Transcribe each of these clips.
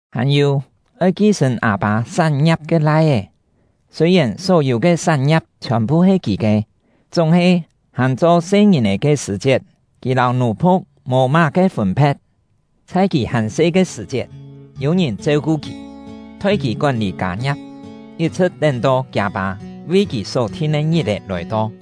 Hàn-yû, oi ki-sṳ̀n â-pâ sán-ngia̍p ke lai-é, sûi-yèn só-yû ke sán-ngia̍p chhiòn-phu he kì ke, chúng-he hàn cho se-ngìn-è ke sṳ̀-chiet, kì lâu nù-phu̍k mò má-ke fûn-phe̍t. Chhai kì hàn se ke sṳ̀-chiet, yû ngìn cheu-ku kì, thoi kì kón-lî kâ-ngia̍p, yit-chhṳ̍t tén-to kiâ-pâ vi kì só thin ke ngit-è lòi-to.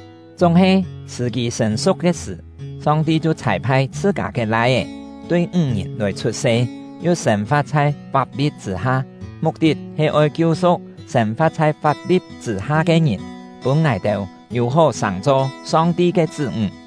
Chúng-he, sṳ̀-kî sṳ̀n-su̍k ke sṳ̀, Song-ti chhiu chhâi-phai chhṳ-kâ ke Lai-é, tui ńg-ngìn lòi chhut-se, yu sên-fa̍t chhai fap-li̍t chṳ̂-ha, muk-tit he oi kiu-su̍k sên-fa̍t chhai fap-li̍t chṳ̂-ha ke ngìn, pûn ngài-têu yû-hó sàng-cho Song-ti ke chṳ́-ńg.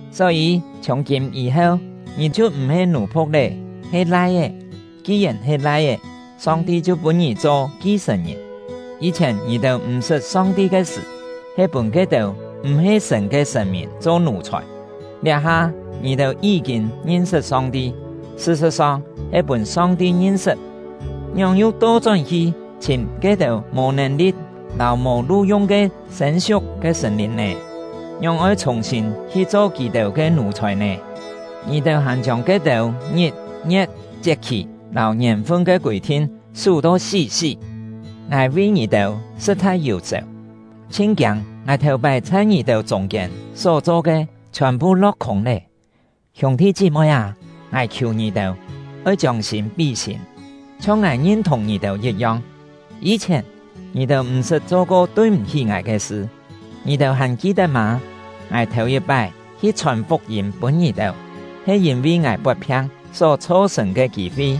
Só-yî, chhiùng-kîm yî-heu, ngì chhiu m̀-he nù-phu̍k lé, he lai-é; ki-yèn he lai-é, Song-ti chhiu pûn ngì cho ki-sṳ̀n-ngìn. Yî-chhièn ngì-têu m̀-sṳt Song-ti ke sṳ̀, he pûn ke-têu m̀-he sṳ̀n ke sṳ̀n-mìn cho nù-chhòi. Liá-ha ngì-têu yí-kîn ngin-sṳt Song-ti (sṳ-sṳ̍t-song he pûn Song-ti ngin-sṳt), ngióng yu to-chón-hi chhìm ke-têu mò nèn-li̍t lâu mò lu-yung ke sên-siuk ke sṳ̀n-lìn “sên-siuk ke sṳ̀n-lìn” ya-he yi̍t-cho “kî-pún ke ngièn-lî”. nè? Ngióng oi chhùng-sîn hi cho kì-têu ke nù-chhòi nè? Ngì-têu hàn chiông ke-têu ngit, ngie̍t, chiet-khì, lâu ngièn-fun ke kûi-thin sú to sí-sí! Ngài vi ngì-têu sṳ̍t-chhai yù-sèu, chhin kiâng ngài thèu-pái chhai ngì-têu chûng-kiên só-cho ke chhiòn-phu lo̍k-khûng lé. Hiûng-thi chí-moi â, ngài khiù ngì-têu, oi chiông sîm pí sîm, chhiong ngài ngin-thùng ngì-têu yit-yong. Yî-chhièn, ngì-têu m̀-sṳt cho-ko tui-m̀-hí ngài ke sṳ. Ngì-têu hàn ki-tet mâ? Ngài thèu-yit-pái hi chhòn fuk-yîm pûn ngì-têu, he yîn-vi ngài pot-phiang só chho-sṳ̀n ke kî-fi.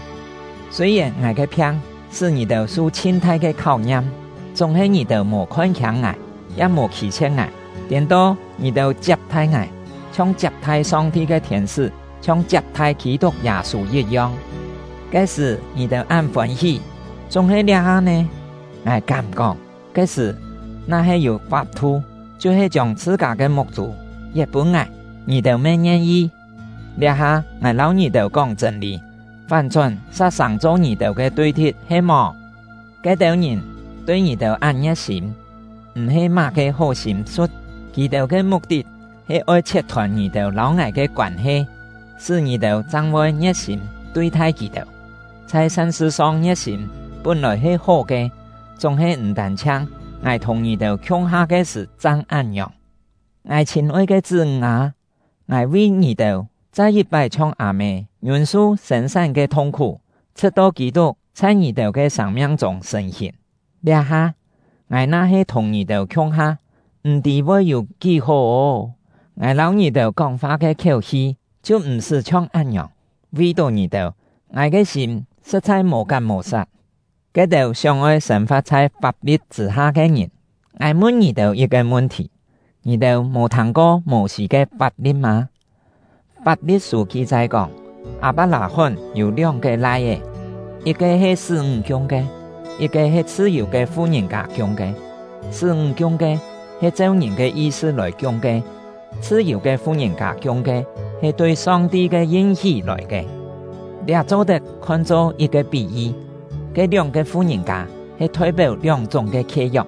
Sûi-yèn ngài ke phiang sṳ́ ngì-têu su chhin thai ke kháu-ngiam, chúng-he ngì-têu mò khon-khiâng ngài, ya mò khî-chhie̍t ngài. Tiên-to, ngì-têu chiap-thai ngài, chhiong chiap-thai Song-ti ke thiên-sṳ́, chhiong chiap-thai Kî-tuk Yâ-sû yit-yong. Ke-sṳ̀ ngì-têu án fôn-hí! Chúng-he liá-ha nè? Ngài kám-kóng, ke-sṳ̀, na-he yû fap-thu, chhiu-he chiông chhṳ-kâ ke muk-chû yet pûn ngài, ngì-têu me ngien-yi. Liá-ha ngài lâu ngì-têu kóng chṳ̂n-lî, fán-chón sa sàng-cho ngì-têu ke tui-thi̍t he-mò? Ke-têu ngìn tui ngì-têu án ngie̍t-sîm, m̀-he má-ke hó sîm-su̍t. Kì-têu ke muk-tit he oi chhiet-thôn ngì-têu lâu ngài ke koân-he, sṳ́ ngì-têu chang voi ngie̍t-sîm tui-thai kì-têu. Chhai san-sṳ-song ngie̍t-sîm pún-lòi he hó ke, chúng-he m̀ tân-chhiang ngài thùng ngì-têu khiung-ha ke sṳ̀ chang án-ngiòng. Ngài chhîn-oi ke chṳ́-ńg â, ngài vi ngì-têu chai yit-pái chhiong â-mê ngiûn-su sên-sán ke thung-khú, chhṳ̍t-to Kî-tuk chhai ngì-têu ke sâng-miang-chûng sṳ̀n-hìn. Liá-ha, ngài na-he thùng ngì-têu khiung-ha, m̀-tî voi yû kí hó ô! Ngài lâu ngì-têu kóng-fa ke khiéu-hi chhiu m̀-sṳ́ chhiong án-ngiòng. Vi-tó ngì-têu, ngài ke sîm sṳ̍t-chhai mò-kat mò-sat! Ke-têu sióng-oi sên-fa̍t chhai fap-li̍t chṳ̂-ha ke ngìn, ngài mun ngì-têu yit-ke mun-thì: Ngì-têu mò thâng-ko Mô-sî ke fap-li̍t mâ? Fap-li̍t-sû ki-chai kóng, Â-pak-lâ-hón yû lióng-ke lai-é, yit-ke he sṳ́-ńg kiung ke, yit-ke he chhṳ-yù ke fu-ngìn-kâ kiung ke. Sṳ́-ńg kiung ke he cheu ngìn ke yi-sṳ lòi kiung ke; chhṳ-yù ke fu-ngìn-kâ kiung ke he tui Song-ti ke yin-hí lòi ke. Liá cho-tet khon-cho yit-ke pí-yi: Ke lióng-ke fu-ngìn-kâ he thoi-péu lióng-chúng ke khie-yok.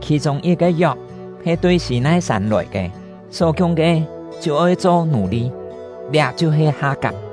Khì-chûng yit-ke yok he tui Sî-nai-sân lòi ke, só kiung ke chhiu oi cho nù-li; liá chhiu-he Ha-kap.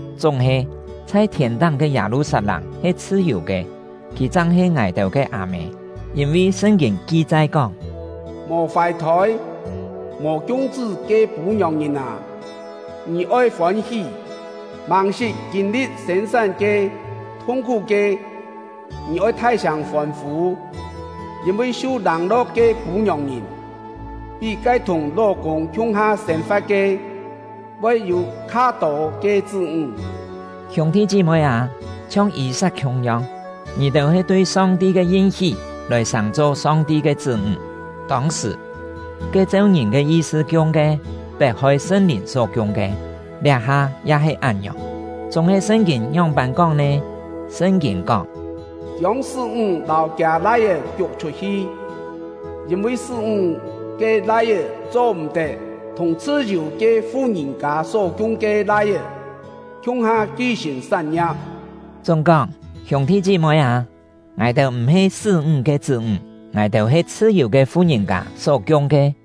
Chúng-he, chhai thiên-táng ke Yâ-lu-sat-lâng he chhṳ-yù ke; kì chang he ngài-têu ke â-mê. Yîn-vi Sṳn-kîn ki-chai kóng: Mò fài-thôi, mò kiung-chṳ́ ke pû-ngiòng-ngìn â, ngì oi fôn-hí! Màng-sṳt kîn-li̍t sên-sán ke thung-khú ke, ngì oi thai-sâng fôn-fû! Yîn-vi su lâng-lo̍k ke pû-ngiòng-ngìn pí ke thùng ló-kûng khiung-ha sên-fa̍t ke, voi yû kha-tô ke chṳ́-ńg! Hiûng-thi chí-moi â, chhiong Yî-sat khiung-yong, ngì-têu he tui Song-ti ke yin-hí lòi sàng-cho Song-ti ke chṳ́-ńg. Tông-sṳ̀, ke cheu ngìn ke yi-sṳ kiung ke, pet-hoi Sṳn-Lìn só kiung ke; liá-ha ya he án-ngiòng. Chúng-he Sṳn-kîn ngióng-pân kóng nè? Sṳn-kîn kóng: “Chiông sṳ́-ńg lâu kiâ lai-é kiuk chhut-hi, yîn-vi sṳ́-ńg ke lai-é cho-m̀-tet thùng chhṳ-yù ke fu-ngìn-kâ só kiung ke lai-é khiung-ha ki-sṳ̀n sán-ngia̍p.” Chúng-kóng, hiûng-thi chí-moi â, ngài-têu m̀-he sṳ́-ńg ke chṳ́-ńg; ngài-têu he chhṳ-yù ke fu-ngìn-kâ só kiung ke.